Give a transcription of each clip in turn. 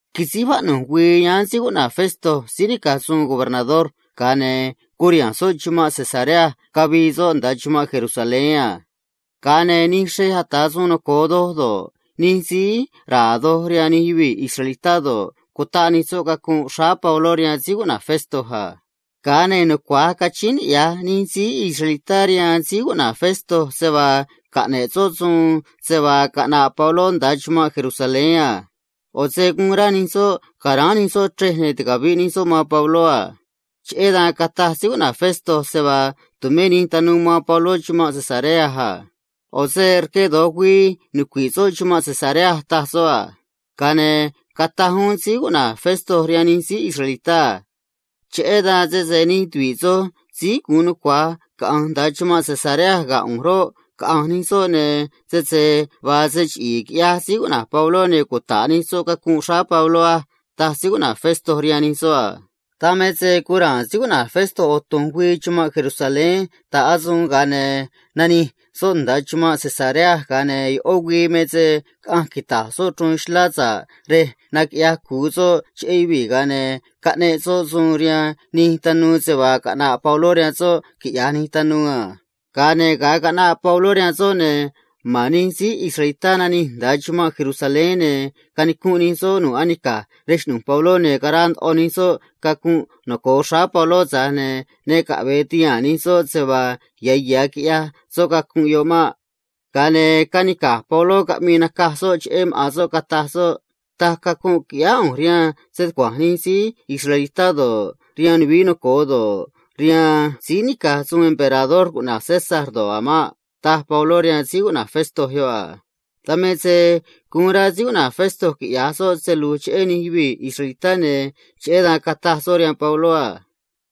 Quisíj vaꞌnu̱j güii yáán síí cuꞌna̱j Festo suun gobernador, ga̱a ne̱ curiha̱nj soꞌ chumanꞌ Cesarea cavii soꞌ nda̱a chumanꞌ Jerusalén a. Ga̱a ne̱ nij xrej ata̱ suun noco̱o do̱ꞌ, nij síí ra̱a̱ doj rihaan nij yuvii̱ israelitá do̱ꞌ, cutaꞌ nij soꞌ cacunꞌ xráá Pabló rihaan Festo a. Ga̱a ne̱ rquee̱ ndoꞌo nij síí israelitá, cachíín niꞌya̱j nij soꞌ rihaan Festo se vaa caꞌne̱ꞌ soꞌ suun se vaa caꞌna̱ꞌ Pabló nda̱a chumanꞌ Jerusalén a. ꞌO̱ se guun rá nij soꞌ ca̱ráán nij soꞌ chrej ne̱ ticavi̱ꞌ nij soꞌ man Pabló a. Cheꞌé dan cataj Festo se vaa tu̱mé nij tanuu man Pabló chumanꞌ Cesarea a. ꞌO̱ se rque do̱j güii nucui̱ꞌ soꞌ chumanꞌ Cesarea, taj soꞌ a. Ga̱a ne̱ cataj uún Festo rihaan nij síí israelitá a: ―Cheꞌé dan sese nij tuvi̱ꞌ soj síí gu̱un nucua̱j caꞌa̱nj nda̱a chumanꞌ Cesarea ga̱ ꞌu̱nj roꞌ, caꞌa̱nj nij soꞌ, ne̱ sese vaa se chiꞌi̱i̱ quiꞌyaj Pabló, ne̱ cuta̱ꞌ nij soꞌ cacunꞌ xráá Pabló á ―taj Festo rihaan nij soꞌ a. Dan me se guun ra̱a̱n Festo ꞌo̱ tu̱nj güii chumanꞌ Jerusalén ta̱ꞌ asuun, ga̱a ne̱ nanij soꞌ nda̱a chumanꞌ Cesarea a. Ga̱a ne̱ ꞌó güii me se caꞌanj quita̱j soꞌ chruun xlá sa̱ꞌ rej naquiꞌyaj cu̱u soꞌ cheꞌé yuvii̱, ga̱a ne̱ caꞌneꞌ soꞌ suun rihaan nij tanuu se vaa caꞌna̱ꞌ Pabló rihaan soꞌ quiꞌya̱j nij tanuu a. Ga̱a ne̱ ga̱a caꞌnaꞌ Pabló rihaan soꞌ, ne̱ ma̱n nij síí israelitá nanij nda̱a chumanꞌ Jerusalén, ne̱ canicunꞌ nij soꞌ nu̱ꞌ anica̱j rej xꞌnu̱j Pabló a. Cutaꞌ ndoꞌo nij soꞌ cacunꞌ noco̱o xráá Pabló, tza̱j ne̱ ne caꞌve̱e ti̱haa̱n nij soꞌ se vaa ya̱ ya̱ quiꞌyaj soꞌ cacunꞌ yoꞌ maꞌ. Ga̱a ne̱ canica̱j Pabló, caꞌmii nacaj soꞌ cheꞌé maꞌa̱n soꞌ, cataj soꞌ a: ―Taj cacunꞌ quiꞌyáá ꞌu̱nj rihaan stucua̱nj nij síí israelitá do̱ꞌ, rihaan nuvií noco̱o do̱ꞌ, rihaan síí nica̱j suun emperador cuꞌna̱j César do̱ꞌ a̱ maꞌ ―taj Pabló rihaan Festo a. Dan me se guun rá Festo quiꞌya̱j soꞌ se lu̱j cheꞌé nij síí ata̱ suun rihaan nij yuvii̱ israelitá, ne̱ cheꞌé dan cataj soꞌ rihaan Pabló a: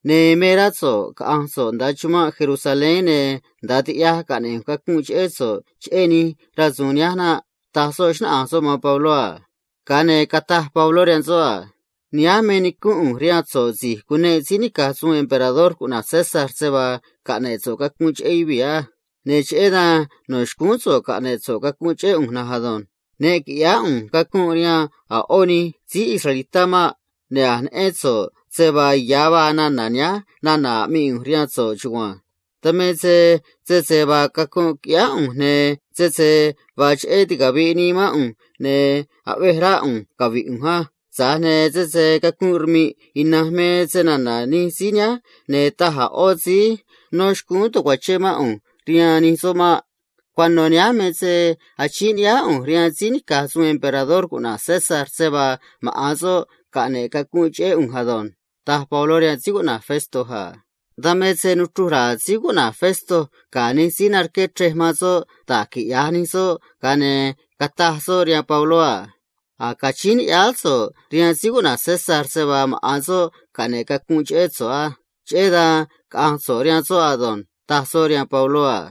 ―Caꞌve̱j rá so̱ꞌ cavi̱i̱ so̱ꞌ nda̱a chumanꞌ Jerusalén ne̱ nda̱a tiꞌyaj caꞌne̱ꞌ ꞌu̱nj cacunꞌ cheꞌé so̱ꞌ cheꞌé nij rasu̱u̱n nihánj naꞌ ―taj soꞌ, xnáꞌanj soꞌ man Pabló a. Ga̱a ne̱ cataj Pabló rihaan soꞌ a: ―Nihánj me nicúnꞌ ꞌu̱nj rihaan so̱ꞌ, si̱j cuneꞌ síí nica̱j suun emperador cuꞌna̱j César se vaa caꞌne̱ꞌ so̱ꞌ cacunꞌ cheꞌé yuvii̱ á. Ne̱ cheꞌé dan no̱ xcúún so̱ꞌ caꞌne̱ꞌ so̱ꞌ cacunꞌ cheꞌé ꞌu̱nj na̱nj ado̱nj. Ne qui̱ꞌyáá ꞌu̱nj cacunꞌ rihaan a̱ ꞌó nij síí israelitá maꞌ. Ne̱ a̱j neꞌén so̱ꞌ se vaa ya̱ vaa nana̱ nihánj nana̱ aꞌmii ꞌu̱nj rihaan so̱ꞌ chugua̱nj. Dan me se sese vaa cacunꞌ quiꞌyáá ꞌu̱nj ne̱ sese vaa cheꞌé ticavi̱ꞌ nii mán ꞌu̱nj, ne̱ aꞌvej rá ꞌu̱nj cavi̱ꞌ ꞌu̱nj á. Tza̱j ne̱ sese cacunꞌ rmi̱ꞌ ina̱nj me snana̱ nij síí nihánj, ne̱ taj a̱ ꞌó síí nó xcúún ta̱cuachén mán ꞌu̱nj rihaan nij soꞌ maꞌ. Cuano̱ nihánj me se achíín ni̱ꞌyáá ꞌu̱nj rihaan síí nica̱j suun emperador cuꞌna̱j César se vaa maꞌa̱n soꞌ caꞌne̱ꞌ cacunꞌ cheꞌé ꞌu̱nj ado̱nj ―taj Pabló rihaan Festo a. Dan me se nuchruj ra̱a̱ Festo ga̱ nij síí narqué chrej man soꞌ da̱j quiꞌya̱j nij soꞌ, ga̱a ne̱ cataj soꞌ rihaan Pabló a: ―A̱j cachíín ni̱ꞌyáá so̱ꞌ rihaan síí cuꞌna̱j César se vaa maꞌa̱n soꞌ caꞌne̱ꞌ cacunꞌ cheꞌé so̱ꞌ á. Cheꞌé dan caꞌa̱nj so̱ꞌ rihaan soꞌ ado̱nj ―taj soꞌ rihaan Pabló a.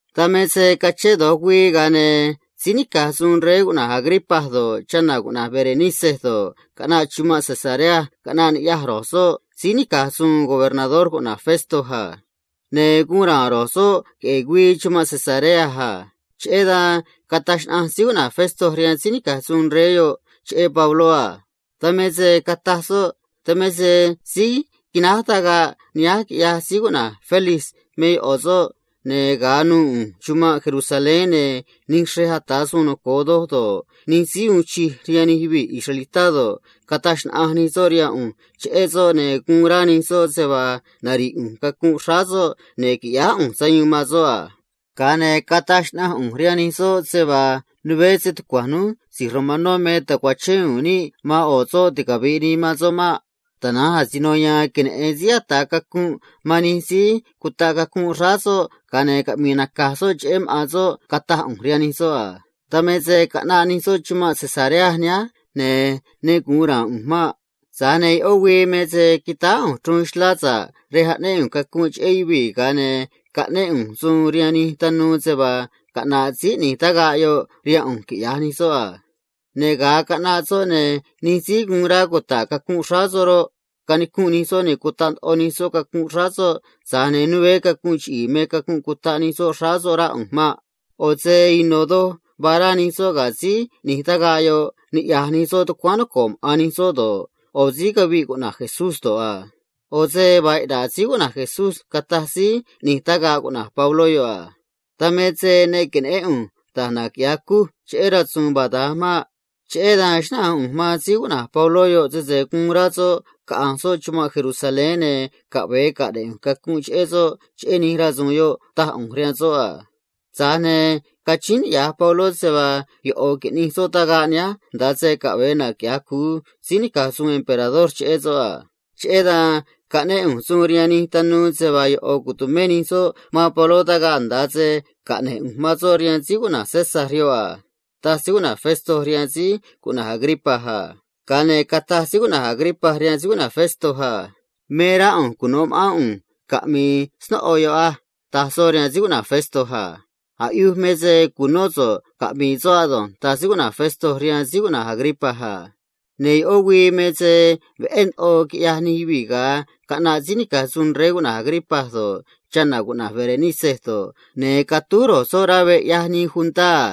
Dan me se cachén do̱j güii, ga̱a ne̱ síí nica̱j suun rey cuꞌna̱j Agripa do̱ꞌ, chana̱ cuꞌna̱j Berenice do̱ꞌ, caꞌnaꞌ chumanꞌ Cesarea, caꞌnaꞌ ni̱ꞌyaj ro̱j soꞌ síí nica̱j suun gobernador cuꞌna̱j Festo a. Ne̱ guun ra̱a̱n ro̱j soꞌ queꞌe̱e̱ güii chumanꞌ Cesarea a. Cheꞌé dan cataj xnaꞌanj Festo rihaan síí nica̱j suun rey yoꞌ cheꞌé Pabló, ne̱ cataj soꞌ a: ―Dan me se síí quináj tagaꞌ nihánj quiꞌyaj Félix me ꞌo̱ soꞌ, ne̱ ga̱a nu̱u̱ ꞌu̱nj chumanꞌ Jerusalén, ne̱ nij xrej ata̱ suun noco̱o do̱ꞌ, nij síí uun chij rihaan nij yuvii̱ israelitá do̱ꞌ, cataj xnaꞌanj nij soꞌ rihaan ꞌu̱nj cheꞌé soꞌ, ne̱ guun rá nij soꞌ se vaa nari̱ꞌ ꞌu̱nj cacunꞌ xráá soꞌ ne̱ qui̱ꞌyáá ꞌu̱nj sayuun man soꞌ a. Ga̱a ne̱ cataj xnaꞌanj ꞌu̱nj rihaan nij soꞌ se vaa né stucua̱nj núj si̱j romanó me ta̱cuachén u̱u̱n níꞌ man ꞌo̱ soꞌ ticavi̱ꞌ nii man soꞌ maꞌ. Tana̱nj asino ya̱a̱n queneꞌe̱n síí ataꞌ cacunꞌ man nij síí cutaꞌ cacunꞌ xráá soꞌ, ga̱a ne̱ caꞌmi̱i̱ nacaj soꞌ cheꞌé maꞌa̱n soꞌ, cataj ꞌu̱nj rihaan nij soꞌ a. ’Dan me se caꞌnaꞌ nij soꞌ chumanꞌ Cesarea nihánj, ne̱ ne gu̱un ra̱a̱n ꞌu̱nj maꞌ. Tana̱nj ꞌó güii me se quitáá ꞌu̱nj chruun xlá sa̱ꞌ rej aꞌnéꞌ ꞌu̱nj cacunꞌ cheꞌé yuvii̱, ga̱a ne̱ caꞌnéꞌ ꞌu̱nj suun rihaan nij tanuu se vaa caꞌna̱ꞌ síí ꞌni̱j tagaꞌ yoꞌ rihaan ꞌu̱nj quiꞌya̱j nij soꞌ a. Ne̱ ga̱a caꞌnaꞌ soꞌ, ne̱ nij síí guun rá cuta̱ꞌ cacunꞌ xráá soꞌ roꞌ, canicunꞌ nij soꞌ ne̱ cutaꞌ ndoꞌo nij soꞌ cacunꞌ xráá soꞌ a. Tza̱j ne̱ né cacu̱nꞌ chiꞌi̱i̱ me cacunꞌ cutaꞌ nij soꞌ xráá soꞌ, rá ꞌu̱nj maꞌ. ꞌO̱ se ino̱ doj vaa rá nij soꞌ ga̱ síí ꞌni̱j tagaꞌ yoꞌ, niꞌya̱j nij soꞌ tucuáán noco̱ꞌ maꞌa̱n nij soꞌ do̱ꞌ, ꞌo̱ síí caviꞌ cuꞌna̱j Jesús do̱ꞌ a. ꞌO̱ se vaa iꞌna̱ꞌ síí cuꞌna̱j Jesús, cataj síí ꞌni̱j tagaꞌ cuꞌna̱j Pabló a. ’Dan me se ne que̱neꞌén ꞌu̱nj da̱j naquiꞌya̱j cuj cheꞌé rasu̱u̱n vaa da̱nj maꞌ. Cheꞌé dan xnáꞌanj ꞌu̱nj man Pabló sese guun rá soꞌ caꞌa̱nj soꞌ chumanꞌ Jerusalén, ne̱ caꞌve̱e caꞌne̱ꞌ ꞌu̱nj cacunꞌ cheꞌé soꞌ cheꞌé nij rasu̱u̱n yoꞌ, taj ꞌu̱nj rihaan soꞌ a. Tza̱j ne̱ cachíín niꞌya̱j Pabló se vaa ꞌo̱ qui̱ꞌnij soꞌ tagaꞌ nihánj nda̱a se caꞌve̱e naquiꞌya̱j cu̱u síí nica̱j suun emperador cheꞌé soꞌ a. Cheꞌé dan caꞌnéꞌ ꞌu̱nj suun rihaan nij tanuu se vaa ꞌo̱ tu̱mé nij soꞌ man Pabló tagaꞌ nda̱a se caꞌne̱j ꞌu̱nj man soꞌ rihaan síí cuꞌna̱j César a ―taj Festo rihaan rey cuꞌna̱j Agripa a. Ga̱a ne̱ cataj rey cuꞌna̱j Agripa rihaan Festo a: ―Me rá ꞌu̱nj cuno̱ ma̱ꞌán ꞌu̱nj caꞌmi̱i̱ snóꞌo yoꞌ á ―taj soꞌ rihaan Festo a. Ga̱a ne̱ cataj Festo a: ―Aꞌyuj me se cu̱nó so̱ꞌ caꞌmi̱i̱ soꞌ ado̱nj ―taj Festo rihaan rey cuꞌna̱j Agripa a. Ne̱ ꞌó güii me se veꞌé ndoꞌo quiꞌyaj nij yuvii̱ ga̱a caꞌnaꞌ rey cuꞌna̱j Agripa do̱ꞌ, chana̱ cuꞌna̱j Berenice do̱ꞌ, ne̱ catúj ro̱j soꞌ rá veꞌ ꞌyaj nii juntá a.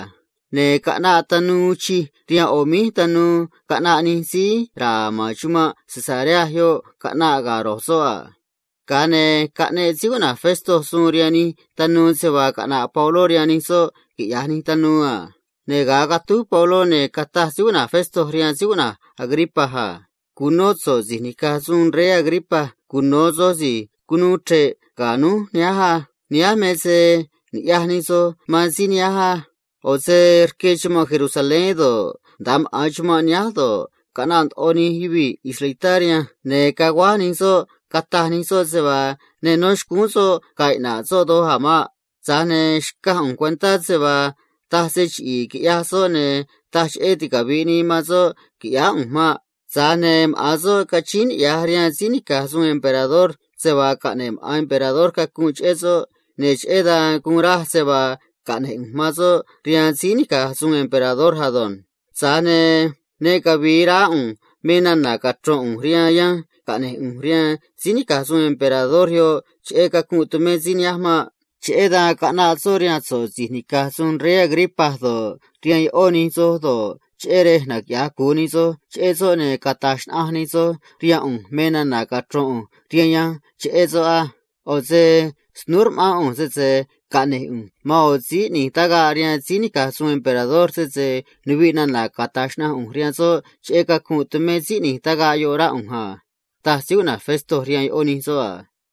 Ne̱ caꞌnaꞌ nij tanuu uun chij rihaan ꞌo̱ míj tanuu caꞌnaꞌ nij síí ra̱a̱ ma̱n chumanꞌ Cesarea yoꞌ caꞌnaꞌ ga̱ ro̱j soꞌ a. Ga̱a ne̱ caꞌneꞌ Festo suun rihaan nij tanuu se vaa caꞌna̱ꞌ Pabló rihaan nij soꞌ quiꞌya̱j nij tanuu a. Ne̱ ga̱a catúj Pabló, ne̱ cataj Festo rihaan rey cuꞌna̱j Agripa a: ―Cu̱nó so̱ꞌ, si̱j nica̱j suun rey Agripa. Cuno̱ soj si̱j cunuu chre̱ꞌ ga̱ núj nihánj á. Nihánj me se ni̱ꞌyaj nij soj man síí nihánj á. ꞌO̱ se rque chumanꞌ Jerusalén do̱ꞌ, nda̱a maꞌa̱n chumanꞌ nihánj do̱ꞌ, caꞌnaꞌ ndoꞌo nij yuvii̱ israelitá rihanj ne̱ caguáj nij soꞌ cataj nij soꞌ se vaa ne nó xcúún soꞌ ga̱a̱ iꞌna̱ꞌ soꞌ doj a̱ maꞌ. Tza̱j ne̱ xcaj ꞌu̱nj cuentá se vaa taj se chiꞌi̱i̱ quiꞌyaj soꞌ, ne̱ taj cheꞌé ticavi̱ꞌ nii man soꞌ qui̱ꞌyáá ꞌu̱nj maꞌ. Tza̱j ne̱ maꞌa̱n soꞌ cachíín niꞌya̱j rihaan síí nica̱j suun emperador se vaa caꞌne̱ꞌ maꞌa̱n emperador cacunꞌ cheꞌé soꞌ, ne̱ cheꞌé dan guun raj se vaa caꞌne̱j ꞌu̱nj man soꞌ rihaan emperador ado̱nj. Tza̱j ne̱ ne cavi̱i̱ raá ꞌu̱nj me nana̱ cachro̱n ꞌu̱nj rihaan yanj caꞌne̱j ꞌu̱nj rihaan síí nica̱j suun emperador yoꞌ cheꞌé cacunꞌ tumé síí nihánj maꞌ. Cheꞌé dan caꞌnaꞌ soꞌ rihaan so̱ꞌ si̱j nica̱j suun rey Agripa do̱ꞌ, rihaan ꞌó nij soj do̱ꞌ, cheꞌé rej naquiꞌya̱j cu̱u nij soj cheꞌé soꞌ ne̱ cata̱j xnaꞌanj nij soj rihaan ꞌu̱nj me nana̱ cachro̱n ꞌu̱nj rihaan yanj cheꞌé soꞌ á. ꞌO̱ se snúú rma̱ꞌán ꞌu̱nj, sese caꞌne̱j ꞌu̱nj man ꞌo̱ síí ꞌni̱j tagaꞌ rihaan síí nica̱j suun emperador, sese nuviꞌ nana̱ cata̱j xnaꞌanj ꞌu̱nj rihaan soꞌ cheꞌé cacunꞌ cutaꞌ nii xráá síí ꞌni̱j tagaꞌ yoꞌ, rá ꞌu̱nj a ―taj Festo rihaan ꞌó nij soꞌ a.